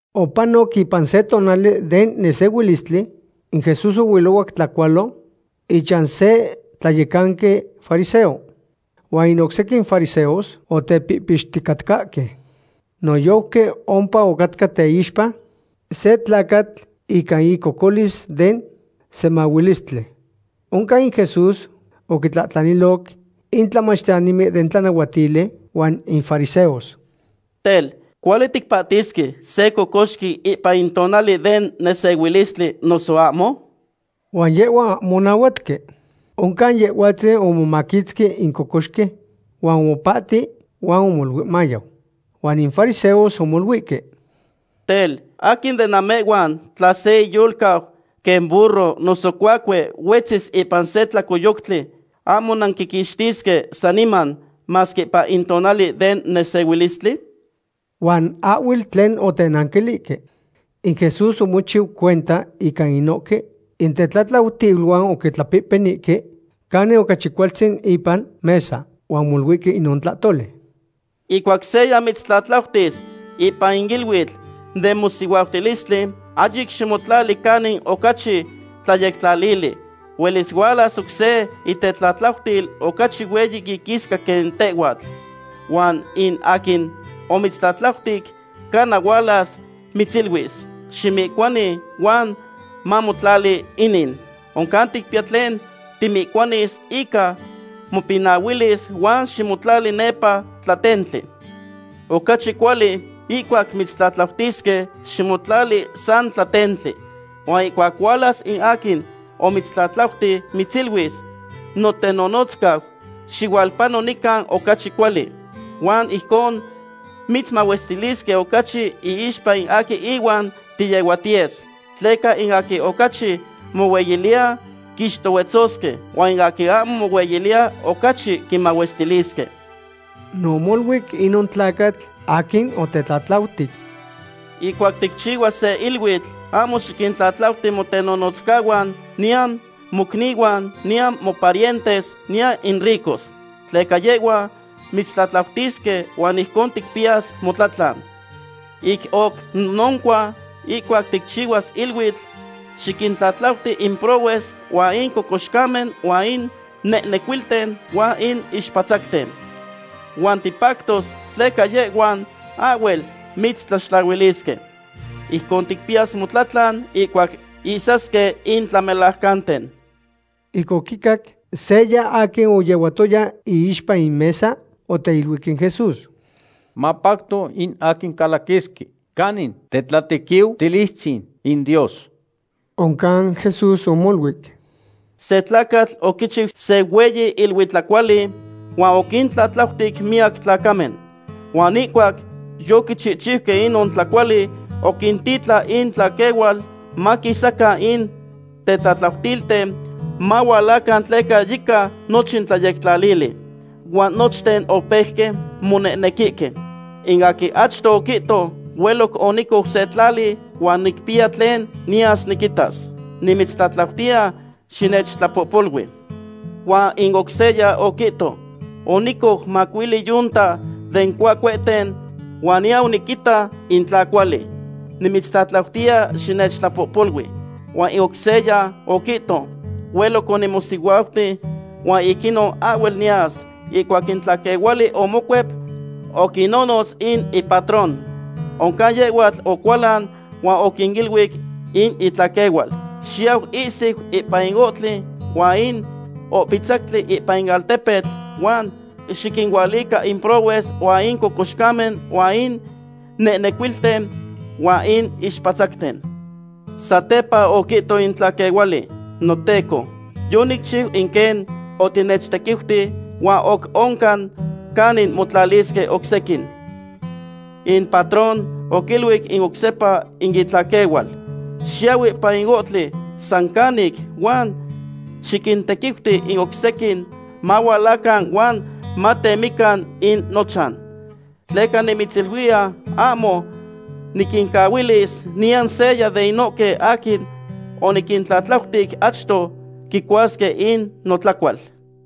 Opanoc ipan se tonali den nesehuilistli in Jesús oilohuac tlacualo ichan se tlayecanqui fariseo. Huan in oc sequin fariseos otepihpixticatcahque. Noyojqui ompa ocatca teixpa se tlacatl ica icocolis den semahuilistli. Oncan in Jesús oquintlahtlaniloc in tlamachtiyanimen den tlanahuatili huan in fariseos: ―Tel, ¿cuali ticpahtisque se cocoxqui ipan in tonali den nesehuilistli, noso ahmo? Huan yehhuan ahmo onahuatque. Oncan Yehhuatzin omomaquitzqui in cocoxqui huan omopahti huan omoluic mayau. Huan in fariseos omoluihque: ―Tel, ¿aquin de namehhuan tla se iyolcau quen burro noso cuacue huetzis ipan se tlacoyoctli, ahmo nanquiquixtisque saniman, masque ipan in tonali den nesehuilistli? Huan ahhuel tlen otenanquilihque. In Jesús omochiu cuenta ica inohque intetlatlautiluan oquitlapehpenihque canin ocachi cualtzin ipan mesa, huan omoluihque inon tlahtoli: ―Ihcuac seya mitztlatlautis ipan in iluitl den mosihuautilistli, ahyic ximotlali canin ocachi tlayectlalili. Huelis hualas oc se itetlatlautil ocachi hueyi iquisca quen tehhuatl. Huan in aquin omitztlatlautic cana hualas mitziluis: “Ximihcuani huan mamotlali inin.” Oncan ticpiya tlen timihcuanis ica mopinahuilis huan ximotlali nepa tlatentli. Ocachi cuali ihcuac mitztlatlautisque, ximotlali sa tlatentli. Huan ihcuac hualas in aquin omitztlatlauti, mitziluis: “Notenonotzcau, xihualpano nican ocachi cuali.” Huan ijcon mitzmahuestilisque ocachi inixpa aquin inuan tiyehuatiyes. Tleca in aquin ocachi mohueyiliya, quixtohuetzosque, huan aquin ahmo mohueyiliya, ocachi quimahuestilisque. No omoluic inon tlacatl aquin otetlatlautic: ―Ihcuac ticchihuas se iluitl, ahmo xiquintlatlautic motenonotzcahuan, niyan mocnihuan, niyan moparientes, niyan in ricos. Tleca yehhuan mitztlatlautisque huan ijcon ticpiyas motlatlan. Ic oc noncua, ihcuac ticchihuas iluitl, xiquintlatlauti in prohues huan in cocoxcamen huan in nehnecuilten huan in ixpatzacten. Huan tipactos, tleca yehhuan ahhuel mitztlaxtlahuilisque. Ijcon ticpiyas motlatlan ihcuac ihsasque in tlamelajcanten. Ic oquicac, seya aquin oyehuatoya iixpa in mesa, oteiluic in Jesús: ―Mapacto in aquin calaquisque canin tetlatequiutilistzin in Dios. Oncan Jesús omoluic: ―Se tlacatl oquichiu se hueyi iluitlacuali, huan oquintlatlautic miyac tlacamen. Huan ihcuac yoquichihchiuque inon tlacuali, oquititlan in itlaquehual maquinnotza in tetlatlautilten mahualacan tleca yica nochin tlayectlalili. Huan nochten opeuque monehnequihque. In aquin achto oquihto: “Hueloc onicou se tlali huan nicpiya tlen niyas niquitas. Nimitztlatlautiya xinechtlapohpolui.” Huan in oc seya oquihto: “Onicou macuili yunta den cuacuehten huan niyau niquinita in tla cuali. Nimitztlatlautiya xinechtlapohpolui.” Huan in oc seya oquihto: “Hueloc onimosihuauti huan ic inon ahhuel niyas.” Ihcuac in tlaquehuali omocuep, oquinonotz in ipatrón. Oncan yehhuatl ocualan huan oquiluic in itlaquehual: “Xiyau ihsiu ipan in ohtli huan in ohpitzactli ipan in altepetl, huan xiquinualica in prohues huan in cocoxcamen huan in nehnecuilten huan in ixpatzacten.” Satepa oquihto in tlaquehuali: “Noteco, yonicchiu in quen otinechtequiuti huan oc oncan canin motlalisque oc sequin.” In patrón oquiluic oc sepa in itlaquehual: “Xiyau ipan in ohtli san canic huan xiquintequiuti in oc sequin mahualacan huan matemican in nochan. Tleca nimitziluiya ahmo niquincahuilis niyan seya de inohque aquin oniquintlatlautic achto quicuasque in notlacual.”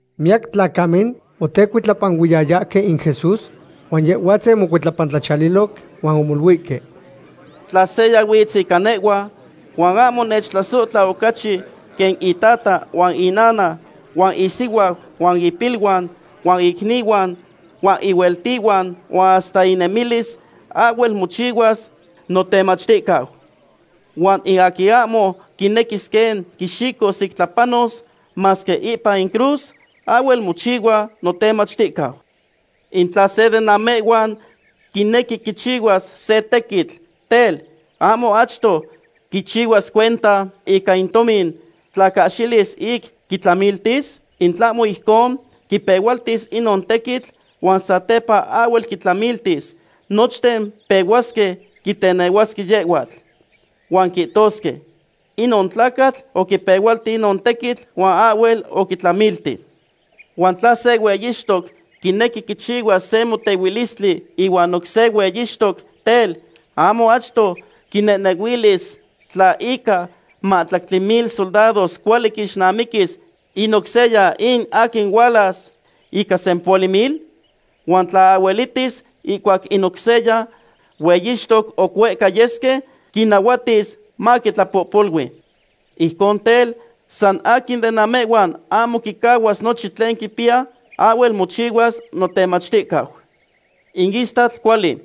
Miyac tlacamen otecuitlapanuiyayahque in Jesús, huan Yehhuatzin omocuitlapantlachiyaliloc huan omoluihque: ―Tla seya huitz ica nehhua, huan ahmo nechtlasohtla ocachi quen itata huan inana huan isihuau huan ipiluan huan icnihuan huan ihueltihuan huan hasta inemilis, ahhuel mochihuas notemachticau. Huan in aquin ahmo quinequis quen quixicos ic tlapanos, masque ipan in cruz, ahhuel mochihua notemachticau. In tla se de namehhuan quinequi quichihuas se tequitl, tel, ¿ahmo achto quichihuas cuenta ica in tomin tla cahxilis ic quitlamiltis? In tlahmo ijcon, quipehualtis inon tequitl, huan satepa ahhuel quitlamiltis, nochten pehuasque quitenehuasque yehhuatl. Huan quihtosque: “Inon tlacatl oquipehualti inon tequitl huan ahhuel oquitlamilti.” Huan tla se hueyixtoc quinequi quichihuas se motehuilistli ihuan oc se hueyixtoc, tel, ¿ahmo achto quinehnehuilis tla ica mahtlactli mil soldados cuali quixnamiquis in oc seya in aquin hualas ica sempohuali mil? Huan tla ahhuelitis, ihcuac in oc se hueyixtoc oc huehca yesque, quinahuatis maquitlapohpolui. Ijcon tel, san aquin de namehhuan ahmo quicahuas nochin tlen quipiya, ahhuel mochihuas notemachticau. ’In istatl cuali,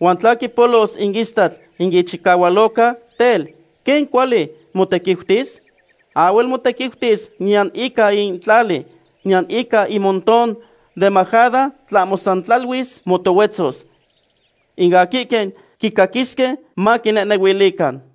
huan tla quipolos in istatl in ichicahualoca, tel, ¿quen cuali motequiutis? Ahhuel motequiutis niyan ica in tlali, niyan ica in montón den majada, tlahmo sa tlaluis motohuetzos. In aquihque quicaquisque, maquinehnehuilican.